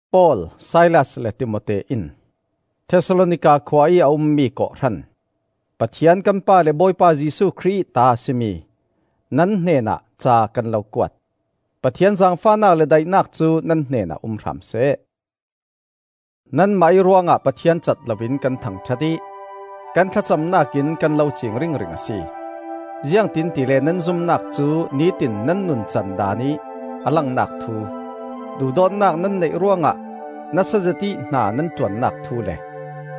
Paul, Silas le Timote in, Thesalonika khua ih a ummi kawhhran, Pathian kan Pa le Bawipa Jesuh Khrih ih ta a si mi, nan hnenah ca kan lo kuat. Pathian zaangfahnak le daihnak cu nan hnenah um hram seh. Nanmah ih ruangah Pathian cat loin kan thangṭhat ih kan thlacamnak in kan lo ciing ringring a si. Ziangtin tile nan zumnak cu nitin nan nuncan daanih a langnak thu, duhdawtnak nan neih ruangah nasa zetih hna nan ṭuannak thu le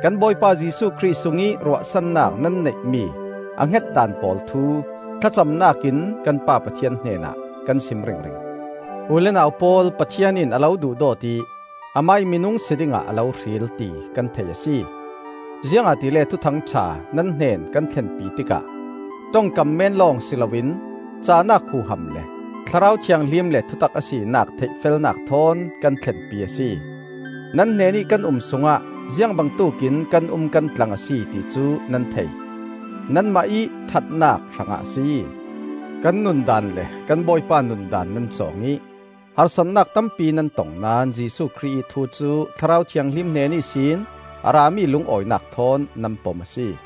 kan Bawipa Jesuh Khrih sungih ruahsannak nan neihmi a hnget daan pawl thu thlacamnak in kan Pa Pathian hnenah kan sim ringring. U le nau pawl, Pathian in a lo duhdawt ih amah ih minung si dingah a lo hril, ti kan thei a si. Ziangahtile Thuthang ṭha nan hnen kan thlenpi tikah ṭongkam men lawng si loin cahnak huham le Thlarau Thianghlim le thutak a sinak theihfelnak thawn kan thlenpi a si. Nan hnenih kan um sungah ziangbangtuk in kan um kan tlang a si, ti cu nan thei; nanmah ih ṭhatnak hrangah a si. Kan nundaan le kan Bawipa nundaan nan cawng ih harsatnak tampi nan tong naón Jesuh Khrih ih thu cu Thlarau Thianghlim hnen ihsin a rami lungawinak thawn nan pom a si.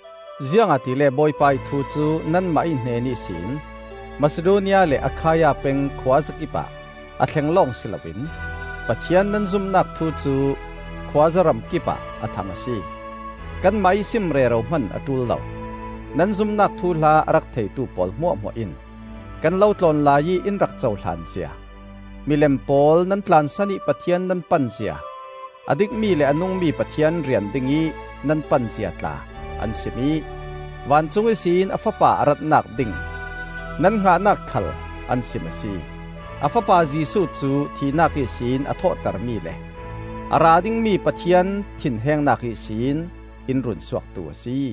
Ziangahtile Bawipa ih thu cu nanmah ih hnen ihsin Masidonia le Akhaia peng khuazakip ah a thlen lawng si loin Pathian nan zumnak thu cu khuaza ramkipah a thang a si. Kanmah ih sim rero hman a ṭul lo. Nan zumnak thuhla a rak theitu pawl hmuahhmuah in kan lo tlawn laiih in rak cohlan zia, milem pawl nan tlansan ih Pathian nan pan zia, a dikmi le a nungmi Pathian rian dingih nan pan zia tla an sim ih, vancung ihsin a Fapa a ratnak ding nan hngahnak khal an sim a si. A Fapa Jesuh cu thihnak ihsin a thawhtermi le a ra dingmi Pathian thinhengnak ihsin in runsuaktu a si.